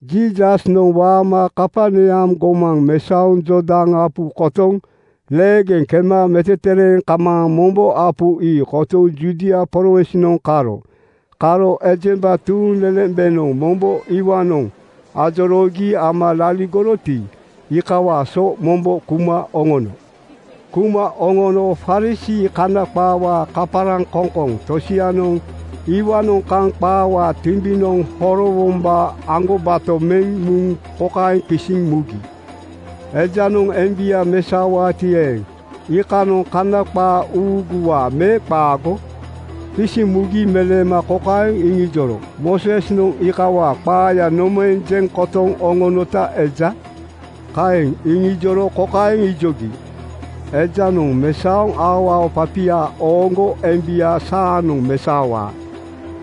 Jiisasnoŋ waama Kaperneam gomaŋ mesaoŋ Jordan apu kotoŋ leegeŋ kema metetereeŋ kamaaŋ mombo apu ii kotoŋ Judia prowinsnoŋ karo. Karo ejemba tuuŋlelembenoŋ mombo iwaanoŋ ajoroogi ama laligoroti, iikawaa so mombo kuma oŋono. Kuma oŋono Farisii (Kana qaawaa kaparaŋkoŋkoŋ) tosianoŋ iwaanoŋ kaŋ qaawaa timbinoŋ horowombaa aŋgobato meŋ muŋ kokaeŋ qisiŋ mugi, “Ejanoŋ embia mesaowaati eeŋ, iikanoŋ Kana qaa uuguwaa me qaago?” Qisiŋ mugi meleema kokaeŋ iŋijoro, “Moosesnoŋ iikawaa qaaya nomaeŋ jeŋ kotoŋ oŋonota eja?” Kaeŋ iŋijoro kokaeŋ ijogi, “Ejanoŋ mesaoŋ aoao papia ooŋgo embia saanoŋ mesaowaa.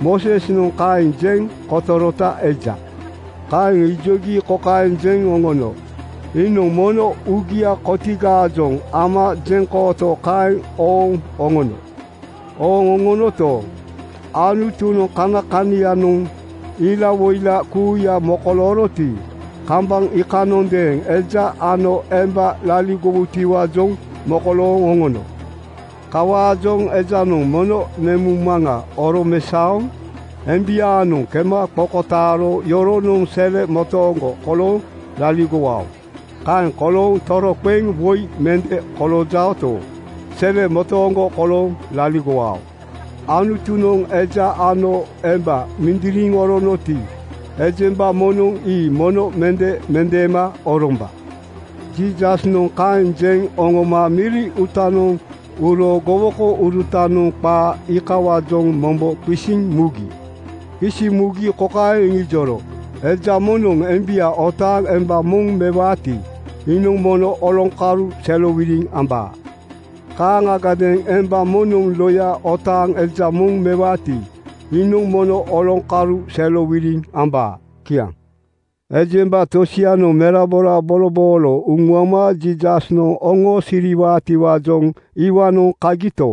Moosesnoŋ kaeŋ jeŋ kotorota eja.” Kaeŋ ijogi kokaeŋ jeŋ oŋono, “Iinoŋ mono uugia kotigaajoŋ ama jeŋkooto kaeŋ ooŋ oŋono. Ooŋ oŋonoto, Anutunoŋ kanakanaiyanoŋ ilawoila kuuya mokolooroti, kambaŋ iikanondeeŋ ‘Eja ano emba laligowutiwaajoŋ mokolooŋ oŋono. Kawaajoŋ ejanoŋ mono nemuŋmaŋa oromesaoŋ embiaanoŋ kema qokotaaro yoronoŋ sele motooŋgo kolooŋ laligowao. Kaeŋ kolooŋ toroqeŋ woi mende koloojaoto, sele motooŋgo kolooŋ laligowao. Anutunoŋ eja ano emba mindiriŋ oronoti, ejemba moŋnoŋ ii mono mende mendeema oromba.” Jiisasnoŋ kaeŋ jeŋ oŋoma miri uutanoŋ uro gowokourutanoŋ qaa iikawaajoŋ mombo qisiŋ mugi. Qisiŋ mugi kokaeŋ iŋijoro, “Eja moŋnoŋ embia otaaŋ emba moŋ mewaati, iinoŋ mono oloŋkalu serowiliŋ ambaa. Kaaŋagadeeŋ emba moŋnoŋ loya otaaŋ eja moŋ mewaati, iinoŋ mono oloŋkalu serowiliŋ ambaa.” Kiaŋ. Ejemba tosianoŋ merabora boloboolo uŋuama Jiisasnoŋ oŋoosiriwaatiwaajoŋ iwaanoŋ kagito,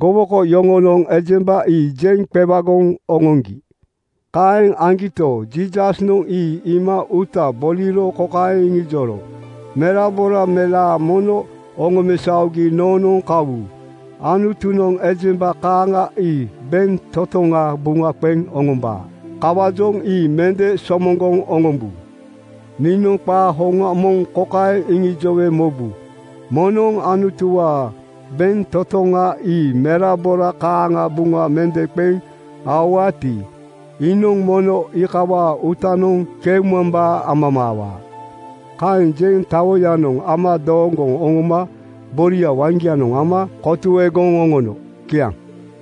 gowoko yoŋonoŋ ejemba ii jeŋ qewagoŋ oŋoŋgi. Kaeŋ aŋgito, Jiisasnoŋ ii iima uuta boliro kokaeŋ iŋijoro, “Merabora melaa mono oŋomesaogi noonoŋ kawu. Anutunoŋ ejemba kaaŋa ii bentotoŋa buŋa qeŋ oŋombaa. Kawaajoŋ ii mende somoŋgoŋ oŋombu. Niinoŋ qaa hoŋa moŋ kokaeŋ iŋijowe mobu: Moŋnoŋ Anutuwaa bentotoŋa ii merabora kaaŋa buŋa mende qeŋ aowaati, iinoŋ mono iikawaa uutanoŋ keumambaa amamaawaa.” Kaeŋ jeŋ tawoyanoŋ ama dooŋgoŋ oŋoma boria waŋgianoŋ ama kotuegoŋ oŋono. Kiaŋ.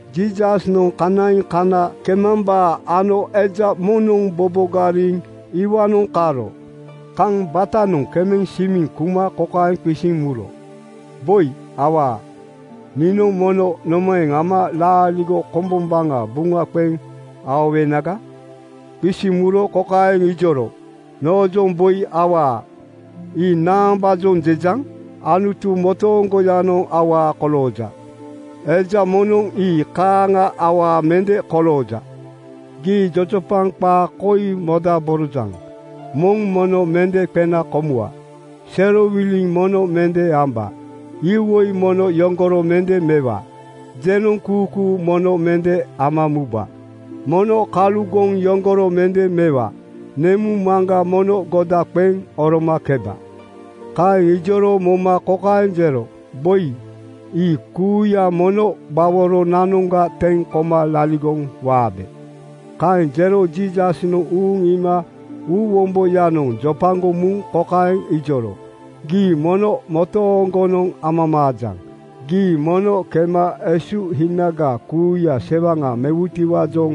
Jiisasnoŋ kanaiŋ kana kemambaa ano eja moŋnoŋ bobogariŋ iwaanoŋ karo. Kaŋ batanoŋ kemeŋ simiŋ kuma kokaeŋ qisiŋ muro, “Boi awaa, niinoŋ mono nomaeŋ ama laaligo kombombaŋa buŋa qeŋ aowenaga?” Qisiŋ muro kokaeŋ ijoro, “Noojoŋ ‘Boi awaa,’ ii naambaajoŋ jejaŋ? Anutu motooŋgoyanoŋ awaa kolooja. Eja moŋnoŋ ii kaaŋa awaa mende kolooja. Gii jojopaŋ qaa koi modaborojaŋ: ‘Moŋ mono mende qena komuwa. Serowiliŋ mono mende amba. Iwoi mono yoŋgoro mende mewa. Jenoŋkuukuu mono mende ama muba. Mono kalugoŋ yoŋgoro mende mewa. Nemuŋ maŋga mono goda qeŋ oromakeba.” ’ Kaeŋ ijoro moma kokaeŋ jero, “Boi, ii kuuya mono gbaworonanoŋga teŋ koma laligoŋ waabe.” Kaeŋ jero Jiisasnoŋ uuŋ iima uuwomboyanoŋ jopagoŋ muŋ kokaeŋ ijoro, “Gii mono motooŋgonoŋ amamaajaŋ: Gii mono kema esuhinaga kuuya sewaŋa mewutiwaajoŋ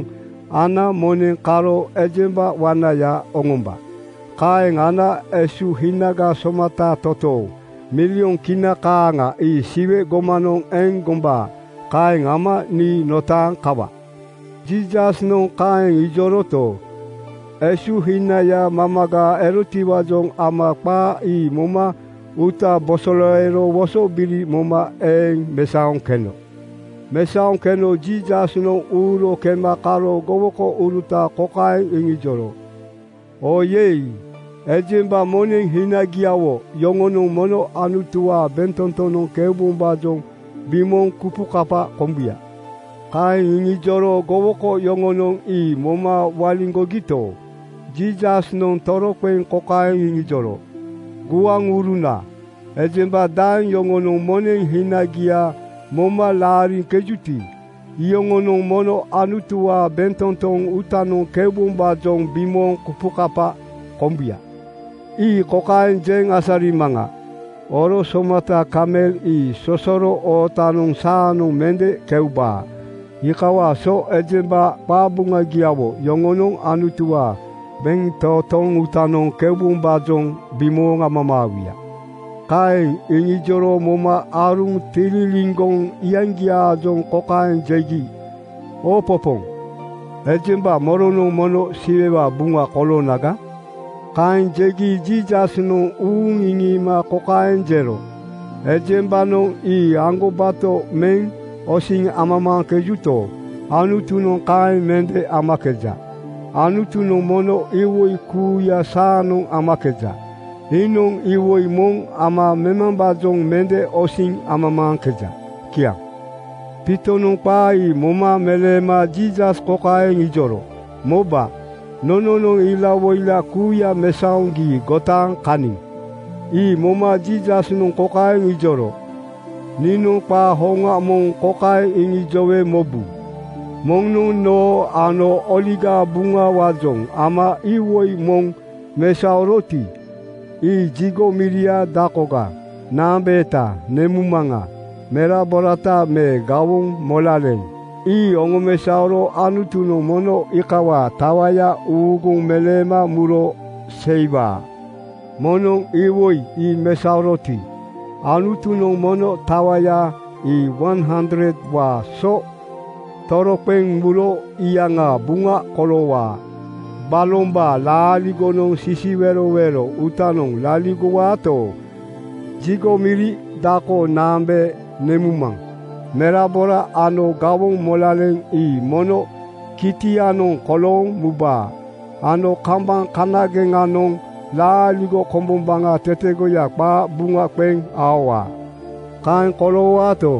ana moneŋ karo ejemba wanaya oŋomba. Kaeŋ ana esuhinaga somata totooŋ (milyon Kina kaaŋa) ii Siwe gomanoŋ eŋ gombaa. Kaeŋ ama nii notaaŋ kawa.” Jiisasnoŋ kaeŋ ijoroto, esuhinaya mamaga erotiwaajoŋ ama qaa ii moma uuta bosoleero wosobiri moma eeŋ mesaoŋ keno. Mesaoŋ keno Jiisasnoŋ uuro kema karo gowokouruta kokaeŋ iŋijoro, “Oyei! Ejemba moneŋ hinagiawo yoŋonoŋ mono Anutuwaa bentotonoŋ keubombaajoŋ bimooŋ kupukapa kombuya.” Kaeŋ iŋijoro gowoko yoŋonoŋ ii moma waliŋgogito, Jiisasnoŋ toroqeŋ kokaeŋ iŋijoro, “Guaŋuruna, ejemba daeŋ yoŋonoŋ moneŋ hinagia moma laariŋkejuti, iyoŋonoŋ mono Anutuwaa bentotoŋ uutanoŋ keubombaajoŋ bimooŋ kupukapa kombuya. Ii kokaeŋ jeŋ asarimaŋa: Oro somata kamel ii sosoro ootanoŋ saanoŋ mende keubaa. Iikawaa so ejemba qabuŋagiawo yoŋonoŋ Anutuwaa bentotoŋ uutanoŋ keubombaajoŋ bimooŋ amamaawuya.” Kaeŋ iŋijoro moma aaruŋ tililiŋgoŋ iyaŋgiaajoŋ kokaeŋ jegi, “Oopopooŋ! Ejemba moronoŋ mono Siwewaa buŋa koloonaga?” Kaeŋ jegi Jiisasnoŋ uuŋ iŋiima kokaeŋ jero, “Ejembanoŋ ii aŋgobato meŋ osiŋ amamaaŋkejuto, Anutunoŋ kaeŋ mende amakeja. Anutunoŋ mono iwoi kuuya saanoŋ amakeja. Iinoŋ iwoi moŋ ama memambaajoŋ mende osiŋ amamaaŋkeja.” Kiaŋ. Piitonoŋ qaa ii moma meleema Jiisas kokaeŋ ijoro, “Moba, nononoŋ ilawoila kuuya mesaoŋ gii gotaaŋ kaniŋ.” Ii moma Jiisasnoŋ kokaeŋ ijoro, “Niinoŋ qaa hoŋa moŋ kokaeŋ iŋijowe mobu: Moŋnoŋ noo ano Oligaa Buŋawaajoŋ ama iwoi moŋ mesaoroti, ii jigo miria, dakoga, naambeeta, nemuŋmaŋa, meraborata me gawoŋ molaleŋa ii oŋomesaoro Anutunoŋ mono iikawaa tawaya uuguŋ meleema muro seiwaa. Moŋnoŋ iwoi ii mesaoroti, Anutunoŋ mono tawaya ii 100:waa so toroqeŋ muro iyaŋaa buŋa koloowaa. Balombaa laaligonoŋ sisiwerowero uutanoŋ laligowaato, jigo miri, dako, naambee, nemuŋmaŋ, merabora ano gawoŋ molaleŋa ii mono kitianoŋ kolooŋ mubaa ano kambaŋ kanageŋanoŋ laaligo komboŋa tetegoya qaa buŋa qeŋ aowaa. Kaeŋ koloowaato,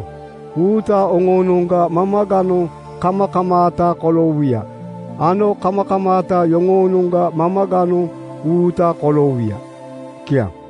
uuta oŋoonoŋga mamaganoŋ kamakamaata koloowuya ano kamakamaata yoŋoonoŋga mamaganoŋ uuta koloowuya.” Kiaŋ.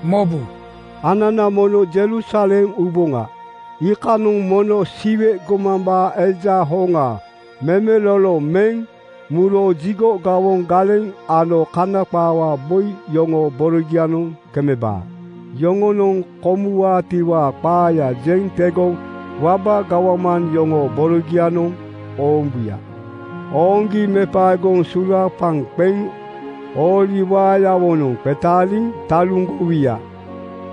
“Mobu, anana mono Jerusalem uboŋa. Iikanoŋ moŋnoŋ Siwe gomambaa Eja hoŋa memelolo meŋ muro jigo gawoŋ galeŋ ano Kana qaawaa boi yoŋoo borogianoŋ kemebaa. Yoŋonoŋ komuwaatiwaa qaaya jeŋ tegoŋ waba gawman yoŋoo borogianoŋ oombuya. Ooŋgi mepaegoŋ sulaapaŋ qeŋ ooli waayawonoŋ qetaaliŋ taluŋgowuya.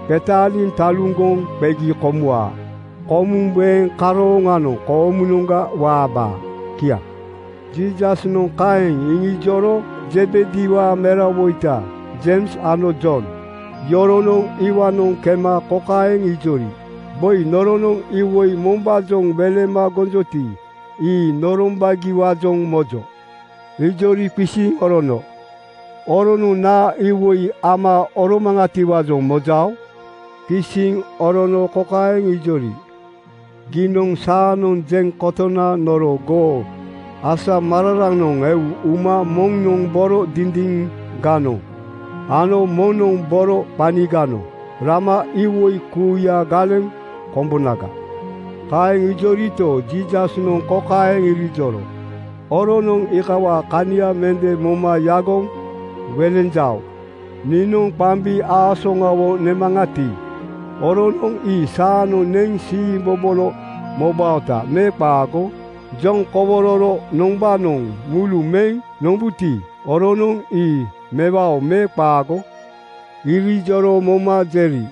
Qetaaliŋ taluŋgoŋ qegi komuwaa. Komuŋ weeŋ karooŋanoŋ koomunoŋga waabaa.” Kiaŋ. Jiisasnoŋ kaeŋ iŋijoro Zebediwaa merawoita Jeims ano Jon yoronoŋ iwaanoŋ kema kokaeŋ ijori, “Boi, noronoŋ iwoi mombaajoŋ welema gonjoti, ii norombagiwaajoŋ mojo.” Ijori qisiŋ orono, “Oronoŋ naa iwoi ama oromaŋatiwaajoŋ mojao?” Qisiŋ orono kokaeŋ ijori, “Giinoŋ saanoŋ jeŋ kotona noro goo asamararanoŋ eu uma moŋnoŋ boro dindiŋganoŋ ano moŋnoŋ boro qaniganoŋ rama iwoi kuuya galeŋ kombonaga.” Kaeŋ ijorito, Jiisasnoŋ kokaeŋ irijoro, “Oronoŋ iikawaa kania mende moma yagoŋ welenjao. Niinoŋ qambi aasoŋawo nemaŋati, oronoŋ ii saanoŋ neŋ siimbobolo mobaota me qaago? Joŋkowororo noŋgbanoŋ mulu meŋ nombuti, oronoŋ ii mewao me qaago?” Irijoro moma jeri,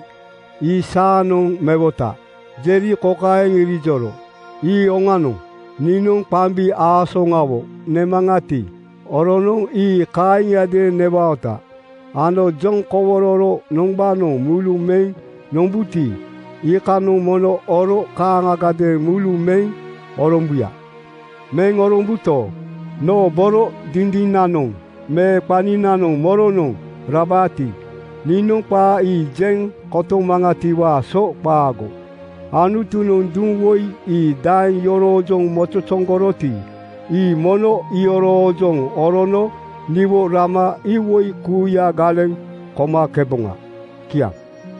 “Ii saanoŋ mewota.” Jeri kokaeŋ irijoro, “Ii oŋanoŋ. Niinoŋ qambi aasoŋawo nemaŋati, oronoŋ ii kaaŋiadeeŋ newaota ano joŋkowororo noŋgbanoŋ mulu meŋ nombuti, iikanoŋ mono oro kaaŋagadeeŋ mulu meŋ orombuya. Meŋ orombuto, noo boro dindinanoŋ me qaninanoŋ moronoŋ rabaati, niinoŋ qaa ii jeŋ kotomaŋatiwaa so qaago. Anutunoŋ duŋ woi ii daeŋ yoroojoŋ mozozoŋgoroti, ii mono iyoroojoŋ orono niwo rama iwoi kuuya galeŋ komakeboŋa.” Kiaŋ.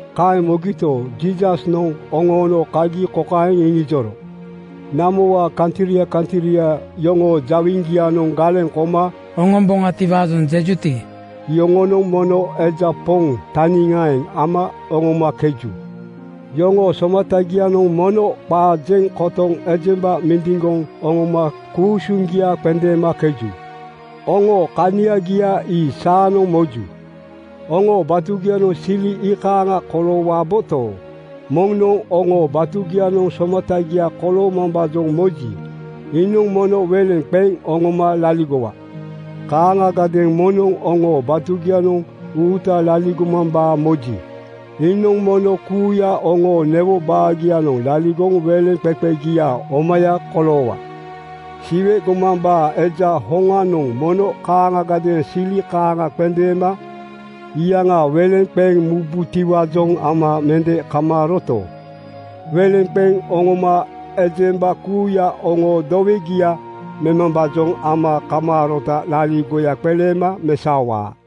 Kaeŋ mogito, Jiisasnoŋ oŋoono kagi kokaeŋ iŋijoro, “Namowaa kantria kantria yoŋoo jawiŋgianoŋ galeŋ koma oŋomboŋatiwaajoŋ jejuti, iyoŋonoŋ mono eja poŋ taniŋaeŋ ama oŋomakeju. Yoŋoo somatagianoŋ mono qaa jeŋ kotoŋ ejemba mindiŋgoŋ oŋoma ku-usuŋgia qendeemakeju. Oŋo kaniagia ii saanoŋ moju. Oŋoo batugianoŋ sili iikaaŋa koloowaboto, moŋnoŋ oŋoo batugianoŋ somatagia koloomambaajoŋ moji, iinoŋ mono weleŋ qeŋ oŋoma laligowa. Kaaŋagadeeŋ moŋnoŋ oŋoo batugianoŋ uuta laligomambaa moji, iinoŋ mono kuuya oŋoo newo baagianoŋ laligoŋ weleŋqeqegia omaya koloowa. Siwe gomambaa Eja hoŋanoŋ mono kaaŋagadeeŋ sili kaaŋa qendeema iyaŋa weleŋ qeŋ mubutiwaajoŋ ama mende kamaaroto, weleŋ qeŋ oŋoma ejemba kuuya oŋoo dowegia memambaajoŋ ama kamaarota laaligoya qeleema mesaowaa.”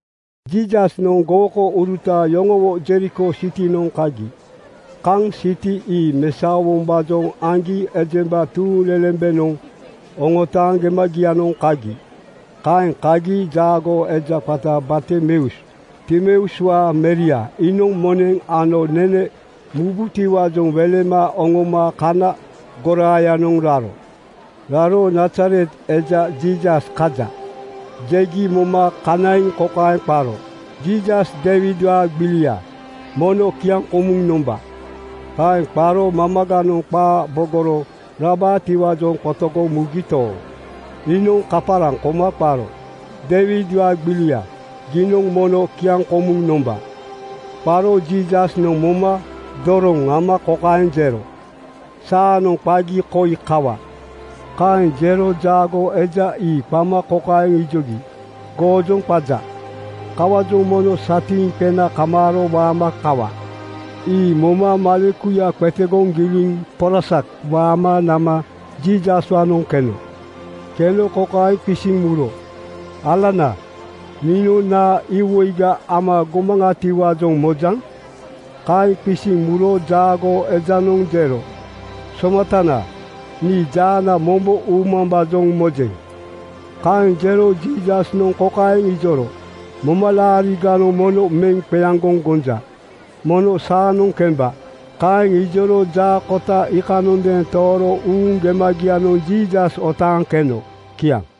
Jiisasnoŋ gowokouruta yoŋowo Jeriko sitinoŋ kagi. Kaŋ siti ii mesaowombaajoŋ aŋgi ejemba tuuŋlelembenoŋ oŋotaaŋ gemagianoŋ kagi. Kaeŋ kagi jaagoo eja qata Bartimeus, Timeuswaa meria iinoŋ moneŋ ano nene mubutiwaajoŋ welema oŋoma kana goraayanoŋ raro. Raro “Nazaret eja Jiisas kaja,” jegi moma kanaiŋ kokaeŋ qaro, “Jiisas Deiwidwaa gbilia, mono kiaŋkomuŋ nomba!” Kaeŋ qaro mamaganoŋ qaa bogoro rabaatiwaajoŋ qotogoŋ mugito, iinoŋ kaparaŋ koma qaro. “Deiwidwaa gbilia, giinoŋ mono kiaŋkomuŋ nomba!” Qaro Jiisasnoŋ moma doroŋ ama kokaeŋ jero, “Saanoŋ qagi koi kawa.” Kaeŋ jero jaagoo eja ii qama kokaeŋ ijogi, “Goojoŋ qaja. Kawaajoŋ mono satiiŋ qena kamaaro waama kawa.” Ii moma malekuya qetegoŋ giliŋ porasak waama nama Jiisaswaanoŋ keno. Keno kokaeŋ qisiŋ muro, “Alana, niinoŋ naa iwoiga ama gomaŋatiwaajoŋ mojaŋ?” Kaeŋ qisiŋ muro jaagoo ejanoŋ jero, “Somatana, nii jaana mombo uumambaajoŋ mojeŋ.” Kaeŋ jero Jiisasnoŋ kokaeŋ ijoro, “Momalaariganoŋ mono meŋ qeaŋgoŋ gonja. Mono saanoŋ kemba.” Kaeŋ ijoro jaa kota iikanondeeŋ tooro uuŋ gemagianoŋ Jiisas otaaŋ keno. Kiaŋ.